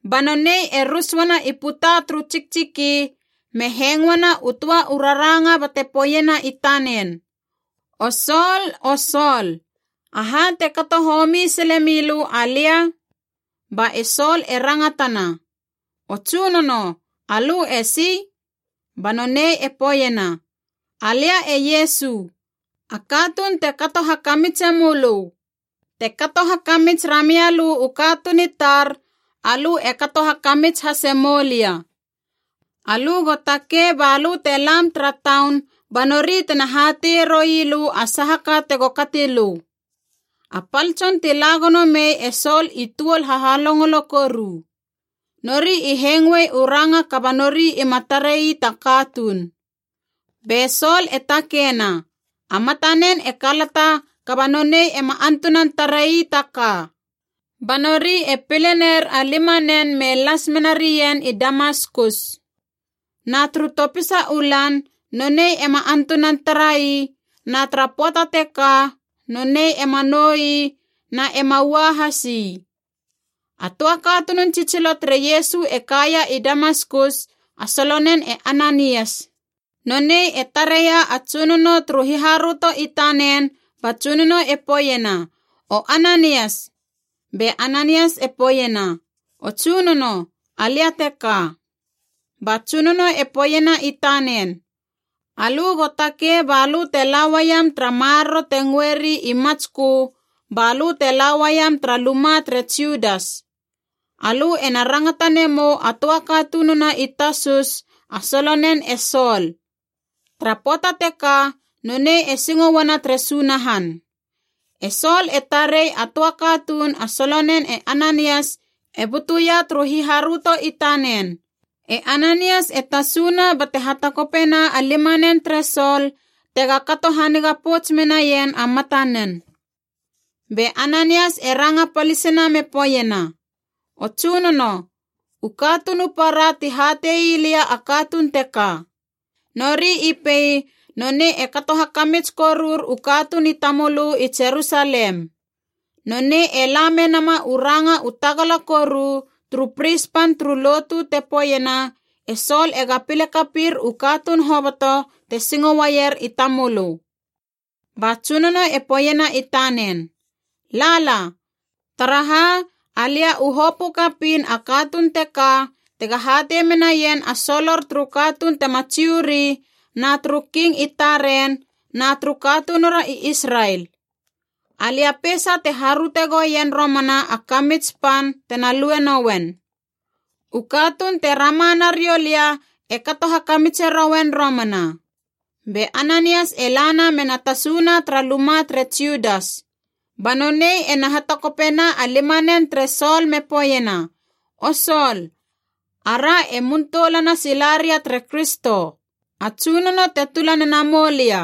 Ba nonei e rus uana i puta turu tsiktsiki, me hengoena u töa u raranga bate poeiena i tanen, “O Sol, o Sol, aha te kato homi sile milö alia?” Ba e Sol e rangatana, “O tsunono, alö esi?” Ba nonei e poeiena, “Alia e Iesu, a katuun te kato hakamitse mölö. Te kato hakamits ramia lö u katuun i tar, alö e kato hakamits hase moulia. Alö go takei balö te lam tara taun ba nori tena hateie rouilö a saha ka tego kati lö.” A pal tson ti la gono mei e Sol i tuol hahalongolo koru. Nori i hengoe u ranga kaba nori ima tarei ta katuun. Be Sol e takeina, a matanen e kalata kaba nonei ema antunan tarei ta ka. Ba nori e pile ner a limanen me las mena rien i Damaskus. Na turu topisa u lan nonei ema antunan tara ii, na tara pöata teka nonei ema nou ii na e ema ua has ii. A töa katunun tsitsilo tere Iesu e kaia i Damaskus, a solonen e Ananias. Nonei e tareia a Tsunono turu hiharöto i tanen ba Tsunono e poeiena, “O Ananias.” Be Ananias e poeiena, “O Tsunono, alia teka.” Ba Tsunono e poeiena i tanen, “Alö go takei balö te la uaiam tara maroro te ngöeri i Matskö, balö te la uaiam tara luma tere Judas. Alö ena rangata nemou a töa katununa i Tasus a solonen e Sol. Tara pöata teka nonei e singo uana tere Sunahan. E Sol e tarei a töa katuun a solonen e Ananias e butuia turu hiharöto i tanen, e Ananias e tasuna bate hatakopena a limanen tere Sol tega kato haniga pouts menaien a matanen.” Be Ananias e ranga palisina me poeiena, “O Tsunono, u katuun u para ti hate ii lia a katuun teka. Nori i pei nonei e kato hakamits korur u katuun i tamölö i Jerusalem. Nonei e la menama u ranga u tagala koru turu pris pan turu lotu te poeiena e Sol ega pile kapir u katuun hoboto te singo uaier i tamölö.” Ba Tsunono e poeiena i tanen, “Lala, taraha alia u hopö kapiin a katuun teka tega hatei menaien a solor turu katuun tema Jiu ri na turu king i taren na turu katunura i Israel. Alia peisa te haröte goien romana a kamits pan tena lue nouen. U katuun te rama nariou lia e kato hakamitse rouen romana.” Be Ananias e lana mena tasuna tara luma tere Judas. Ba nonei ena hatakopena a limanen tere Sol me poeiena, “O Sol, ara e muntoulana sila ria tere Kristo, a Tsunono te tula nena moulia.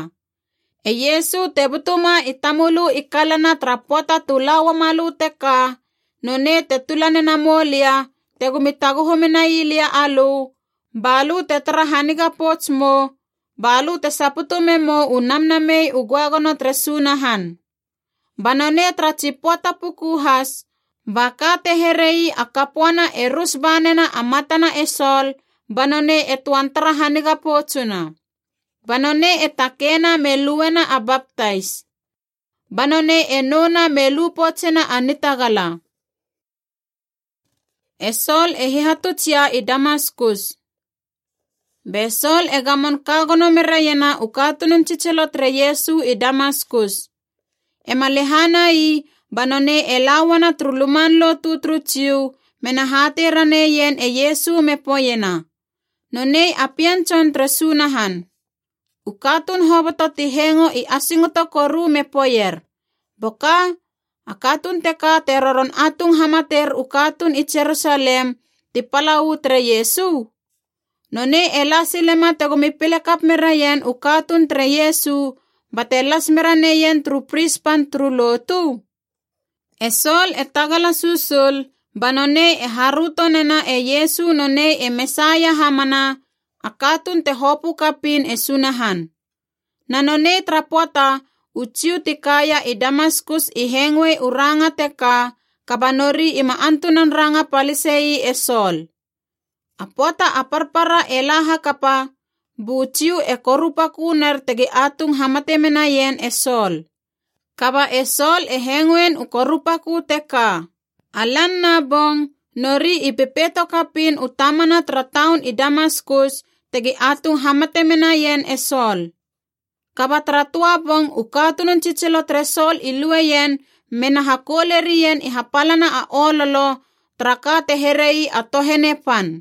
E Iesu, te butuma i tamölö i kalana tara pöata tu la uamalö teka, nonei te tula nena moulia tegomi taguhu menai lia alö balö te tara haniga pouts mou, balö te saputu memou u Namnamei u Göagono tere Sunahan.” Ba nonei tara tsi pöata puku has ba ka te here ii a kapöana e rus ba nena a matana e Sol ba nonei e töan tara haniga poutsuna. Ba nonei e takeina me luena a baptais. Ba nonei e nouna me lu poutsena a nitagala. E Sol e hihatuts ia i Damaskus Be Sol e gamon ka gono meraiena u katunun tsitsilo tere Iesu i Damaskus. Ema lehana ii ba nonei e la uana turu luman lotu turu Jiu mena hatei raneien e Iesu me poeiena, “Nonei a Pien Tson tere Sunahan!” U katuun hoboto ti hengo i asingoto koru me poeier, “Boka! A katuun teka te roron atung hamater u katuun i Jerusalem ti pala uu tere Iesu? Nonei e la silema tegomi pile kap meraien u katuun tere Iesu bate las mera neien turu pris pan turu lotu?” E Sol e tagala susul ba nonei e haröto nena e Iesu nonei e Mesaia hamana, a katuun te hopö kapiin e Sunahan. Na nonei tara pöata u Jiu ti kaia i Damaskus i hengoe u ranga teka kaba nori ima antunan ranga palise ii e Sol. A pöata a parpara e la hakapa, bu Jiu e korupakö ner tegi atung hamate menaien e Sol. Kaba e Sol e hengoin u korupakö teka. A lan na bong, nori i pepeito kapiin u tamana tara taun i Damaskus tegi atung hamate menaien e Sol. Kaba tara töa bong u katunun tsitsilo tere Sol i lueien be na hakoule rien i hapalana a ololo tara ka te here ii a tohene pan.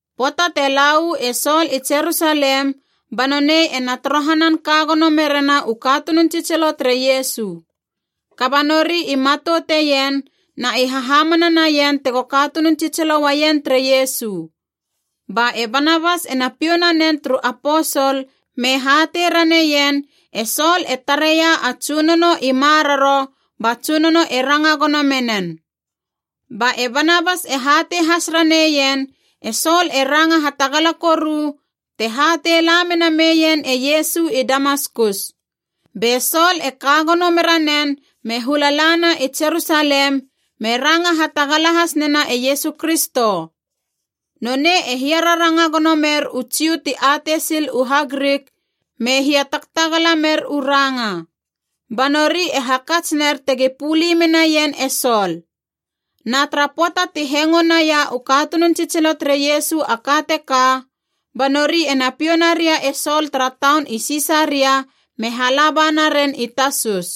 Pöata te la uu e Sol i Jerusalem ba nonei ena torohanan ka gono merena u katunun tsitsilo tere Iesu. Kaba nori i matouteien na i hahamana naien tego katunun tsitsilo uaien tere Iesu. Ba e Banabas ena piou nanen turu aposol me hatei raneien e Sol e tareia a Tsunono i maroro ba Tsunono e ranga gono menen. Ba e Banabas e hatei has raneien e Sol e ranga hatagala koru te hatei la menameien e Iesu i Damaskus. Be Sol e ka gono mera nen me hula lana i Jerusalem, me ranga hatagala has nena e Iesu Kristo. Nonei e hiararanga gono mer u Jiu ti atei sil u HaGrik me hiatagtagala mer u ranga. Ba nori e hakats ner tegi puli menaien e Sol. Na tara pöata ti hengo naia u katunun tsitsilo tere Iesu a ka teka, ba nori ena piou naria e Sol tara taun i Sisaria me hala ba naren i Tasus.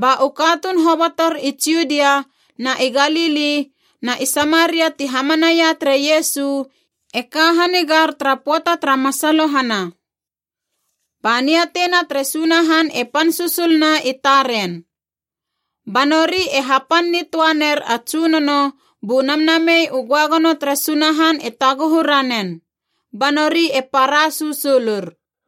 Ba u katuun hobotor i Judia na i Galili na i Samaria ti hamanaia tere Iesu i ka hanigar tara pöata tara masalohana. Ba niateina tere Sunahan e pan susuluna i taren. Ba nori e hapan nitöaner a Tsunono bu Namnamei u Göagono tere Sunahan e taguhu ranen. Ba nori e para susulur.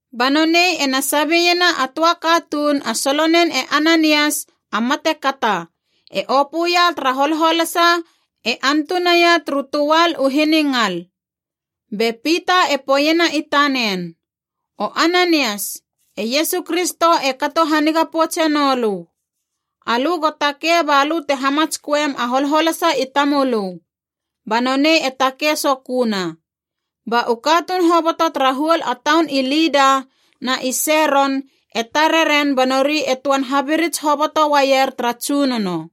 Ba nonei ena sabeiena a töa katuun a solonen e Ananias, a matekata, e opöia tara holholasa e antunaia turu töal u hiningal. Be Pita e poeiena i tanen, “O Ananias, e Iesu Kristo e kato hanige poutse nolö. Alö go takei balö te hamatsköem a holholasa i tamölö.” Ba nonei e takei soköna. Ba u katuun hoboto tara huol a taun i Lida na i Seron e tare ren ba nori e töan habirits hoboto uaier tara Tsunono.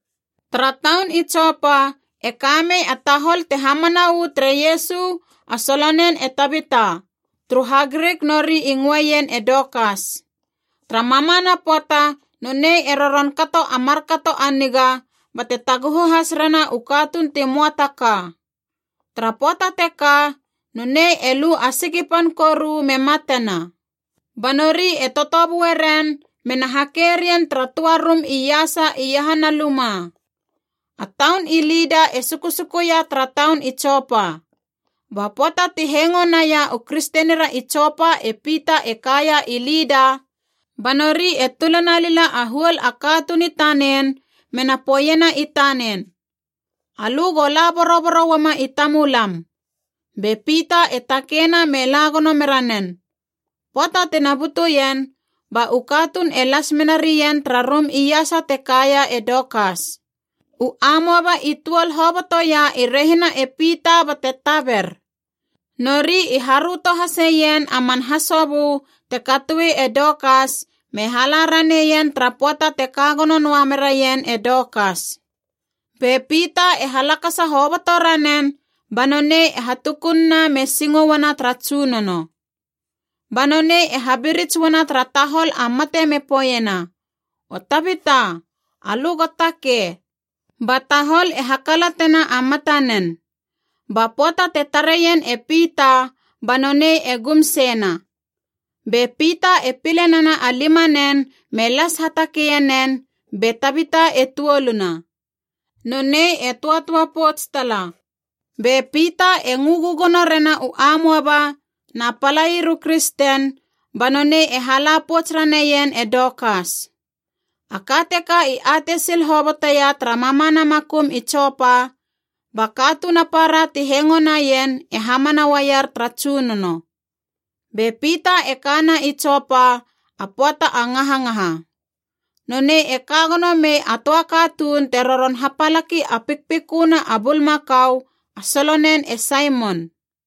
Tara taun i Jopa e kamei a tahol te hamana uu tere Iesu a solonen e Tabita, turu HaGrik nori i ngöeien e Dokas. Tara mamana pöata nonei e roron kato a markato a niga, bate taguhu has rena u katuun ti möa ta ka. Tara pöata teka nonei e lu a siki pan koru me matena. Ba nori e totobue ren mena hake rien tara töa rum iasa iahana luma. A taun i Lida e susukuia tara taun i Jopa. Ba pöata ti hengo naia u kristenira i Jopa e Pita e kaia i Lida, ba nori e tula nalila a huol a katuun i tanen mena poeiena i tanen, “Alö go la boroboro uama i tamulam.” Be Pita e takeina me la gono mera nen. Pöata tina butuien ba u katuun e las menarien tara rum iasa te kaia e Dokas. U amoaba i tuol hobotoia i rehina e Pita bate taber. Nori i haröto haseien a man hasobö te katoe e Dokas me hala raneien tara pöata te ka gono noa meraien e Dokas. Be Pita e halakasa hoboto ranen, ba nonei e hatukununa me singo uana tara Tsunono. Ba nonei e habirits uana tara tahol a mate me poeiena, “O Tabita, alö go takei!” Ba tahol e hakalatena a matanen. Ba pöata te tareien e Pita, ba nonei e gum seina. Be Pita e pile nena a limanen me las hatakeie nen, be Tabita e tuoluna. Nonei e töatöa pouts tala. Be Pita e ngö gögono rena u amoaba na palair u kristen, ba nonei e hala pouts raneien e Dokas. A ka teka i atei sil hoboteia tara mamana makum i Jopa, ba katuun a para ti hengo naien e hamana uaier tara Tsunono. Be Pita e kana i Jopa a pöata a ngahangaha. Nonei e ka gono mei a töa katuun te roron hapalaki a pikpiköna a bulmakau,a a solonen e Saimon.